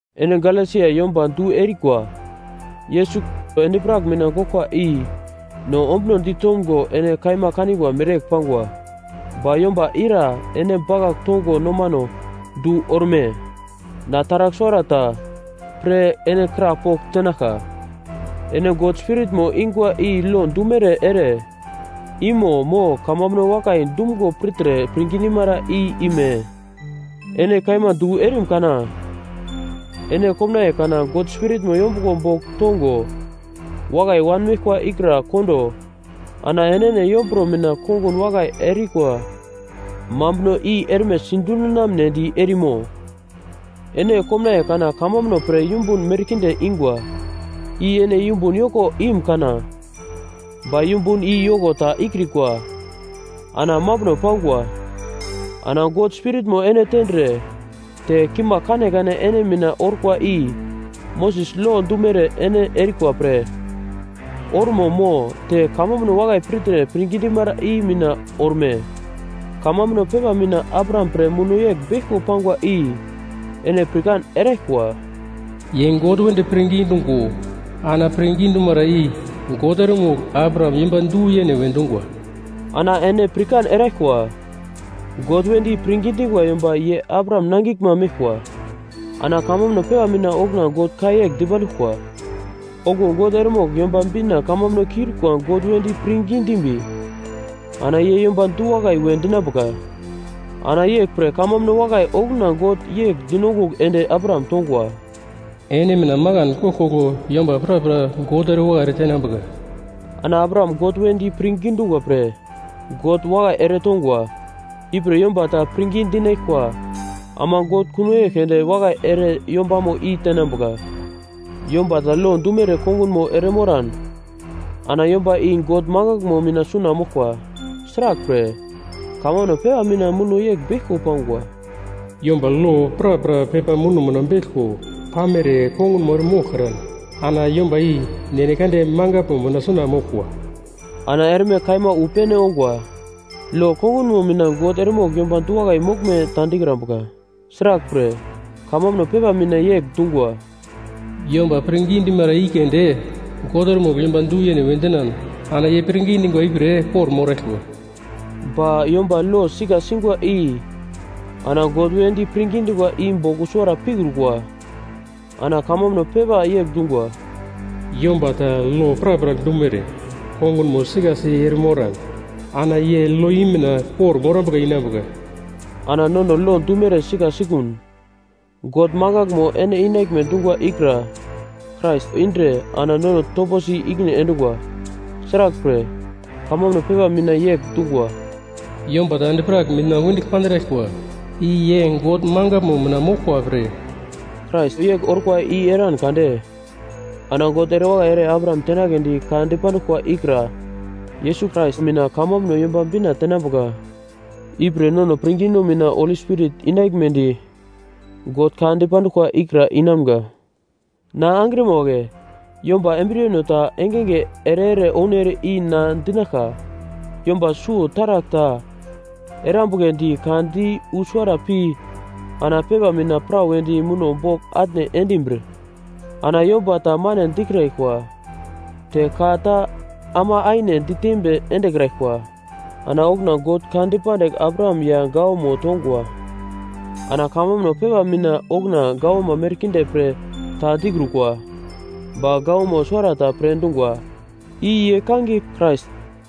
Ene Galesia yomba du erikwa! Yesus Krais endi-prak mina goglkwa i no ombunodi tomgo ene kaima kanigwa mereyegl pangwa. Ba yomba ira ene bakagl tongo nomano du orume? Na taragl suwara ta pre ene krapogl tenaglka: Ene God Spiritmo ingwa i lo dumere ere imo mo kamambuno wakai dumgo pirtre pirngi dimara i ime? Ene kaima du erim kana! Ene komnaiye kana God Spiritmo yombuglo bogl tongo wakai wanmeglkwa ikra kondo ana enene yomburo mina kongun wakai erikwa mambuno i erme sidundinamnedi erimo? Ene komnaiye kana kamambuno pre yumbun merkinde ingwa, i ene yumbun yoko im-kana? Ba yumbun i yoko ta ikrikwa ana mambuno pangwa! Ana God Spiritmo ene tendre te kimagl kanekane ene mina orkwa i Moses lo dumere ene erikwa pre ormo mo te kamambuno wakai pirtre pirngi dimara i mina orme? Kamambuno pepa mina Abraham pre muno yegl beglko pangwa i ene pirkan eraglkwa: “Ye God wedi pirngi dungo, ana pirngi dumara i God eremogl Abraham yomba du-yene we dungwa.” Ana ene pirkan eraglkwa, God wedi pirngi dingwa yomba ye Abraham nangiglma meglkwa. Ana kamambuno pepa mina okuna God ka yegl dipanduglkwa; okuwo God eremogl Yomba Bina kamambuno kiurikwa God wedi pirngi dimbi ana ye yomba du-wakai we dinambuka. Ana yeglpre kamambuno wakai okuna God yegl dinongugl ende Abraham tongwa, “Ene mina makan koglkoglo yomba prapra God erewakai ere tenambuka.” Ana Abraham God wedi pirngi dungwa pre God wakai eretongwa, ipre yomba ta pirngi dinaglkwa ama God kuno yegl keunde wakai ere yombamo i tenambuka. Yomba ta lo dumere kongunmo ere moran ana yomba i God mangaglmo mina suna moglkwa. Sraglpre, kamambuno pepa mina muno yegl beglko pangwa, “Yomba lo prapra pepa muno mina beglko pamere kongunmo ere moglkran, ana yomba i God mangaglmo mina suna moglkwa.” Ana erme kaima wu pene ongwa, lo kongunmo mina God eremogl yomba du-wakai moglme ta dikrambuka. Sraglpre kamambuno pepa mina yegl dungwa, “Yomba pirngi dimara i keunde God eremogl yomba du-yene we dinan ana ye pirngi dingwa ipre kor-moraglkwa.” Ba yomba lo sika singwa i ana God wedi pirngi dingwa i bogl usuwara pikrukwa. Ana kamambuno pepa yegl dungwa, “Yomba ta lo prapra dumere kongunmo sikasi eremoran ana ye lo i mina kor-morambuka inambuka.” Ana nono lo dumere sika sikun, God mangaglmo ene inaglme dungwa ikra Krais indre ana nono toposi ikine endungwa. Sraglpre, kamambuno pepa mina yegl dungwa, “Yomba ta endi-prak mina wendigl pandraglkwa, i ye God mangaglmo mina moglkwa pre.” Krais yegl orkwa i eran kade ana God ere wakai ere Abraham tenagledi ka dipanduglkwa ikra Yesus Krais mina kamambuno Yomba Bina tenambuka. Ipre nono pirngino mina Holi Spirit inaglmedi God ka dipanduglkwa ikra inamga. Na angrima wagle, yomba embriyeno ta engenge ere-ere ounere i na dinaglka: Yomba suwo taragl ta erambugledi ka di wu suwara pi ana pepa mina prawedi muno bogl atne endimbir, ana yomba ta mane dikraglkwa te ka ta ama aine ditembi endekraglkwa. Ana okuna God ka dipandigl Abraham ya gawamo tongwa. Ana kamambuno pepa mina okuna gawama merkinde pre ta dikrukwa, ba gawama suwarata pre dungwa, i ye kangiye “Krais”.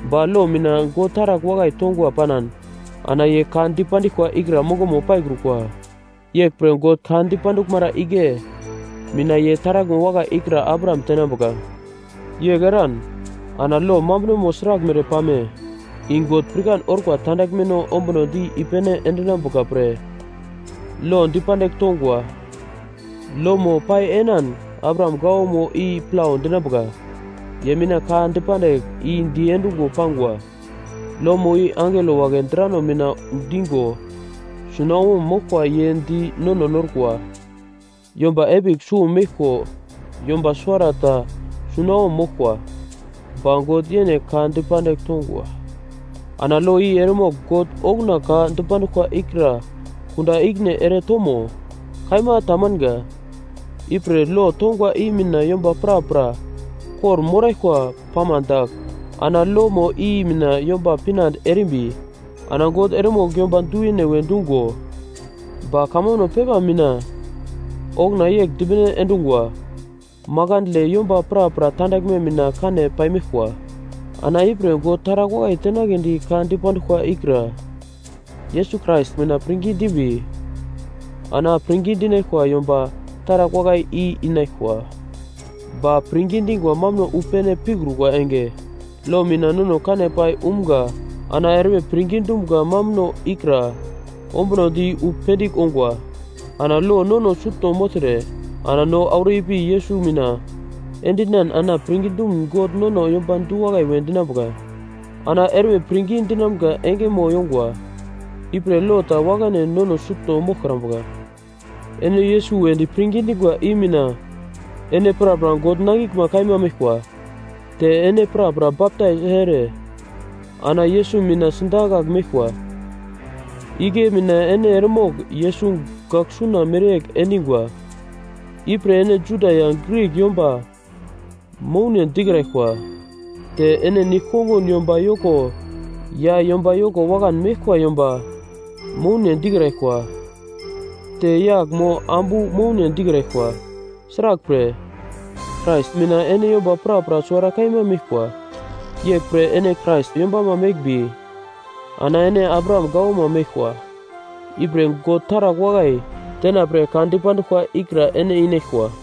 Ba lo mina God taragl wakai tongwa panan ana ye ka dipandiglkwa ikra mongomo paikrukwa. Yeglpre God ka dipanduglmara igle mina ye taraglmo wakai ikra Abraham tenambuka. Yegl eran, ana lo mambunomo sraglmere pame? I God pirkan orkwa tandaglmeno ombunodi i-pene endinambuka pre lo pandigl tongwa. Lomo pai enan Abraham gawamo i plau dinambuka, ye mina ka dipandigl i diendungo pangwa, lomo i angelo wagle drano mina digo sunawom moglkwa ye di nono norkwa. Yomba epigl suwo meglko yomba suwara ta sunawom moglkwa. Ba God yene ka dipandigl tongwa. Ana lo i eremogl God okuna ka dipanduglkwa ikra kunda ikine ere tomo? Kaima tamanga. Ipre lo tongwa i mina yomba prapra kor-moraglkwa pama dagl, ana lomo i mina yomba pinande erimbi ana God eremogl yomba du-yene we dungo. Ba kamambuno pepa mina okuna yegl dipene endungwa; makandle yomba prapra tandaglme mina kane paimeglkwa. Ana ipre God taragl wakai tenagledi ka dipanduglkwa ikra Yesus Krais mina pirngi dimbi ana pirngi dinaglkwa yomba taragl wakai i inaglkwa. Ba pirngi dingwa mambuno wu pene pikrukwa enge, lo mina nono kane pai umga ana erme pirngi dumga mambuno ikra ombunodi wu pendigl ongwa. Ana lo nono sutno mogltre ana no auro ipi Yesus mina endinan ana pirngi dumun God nono yomba du-wakai we dinambuka. Ana erme pirngi dinamga engemo yongwa. Ipre lo ta wakane nono sutno moglkrambuka. Ene Yesus wedi pirngi dingwa i mina ene prapra God nangigle kaima meglkwa. Te ene prapra baptais ere ana Yesus mina sidakagl meglkwa, igle mina ene eremogl Yesus gaglsuna mereyegl endingwa. Ipre ene Juda ya Grik yomba moune dikraglkwa, te ene nigl-kongun yomba yoko ya yomba yoko wakan meglkwa yomba moune dikraglkwa, te yagl mo ambu moune dikraglkwa. Sraglpre, Krais mina ene yomba prapra suwara kaima meglkwa. Yeglpre ene Krais yombama meglmbi ana ene Abraham gawama meglkwa, ipre God taragl wakai tenapre ka dipanduglkwa ikra ene inaglkwa.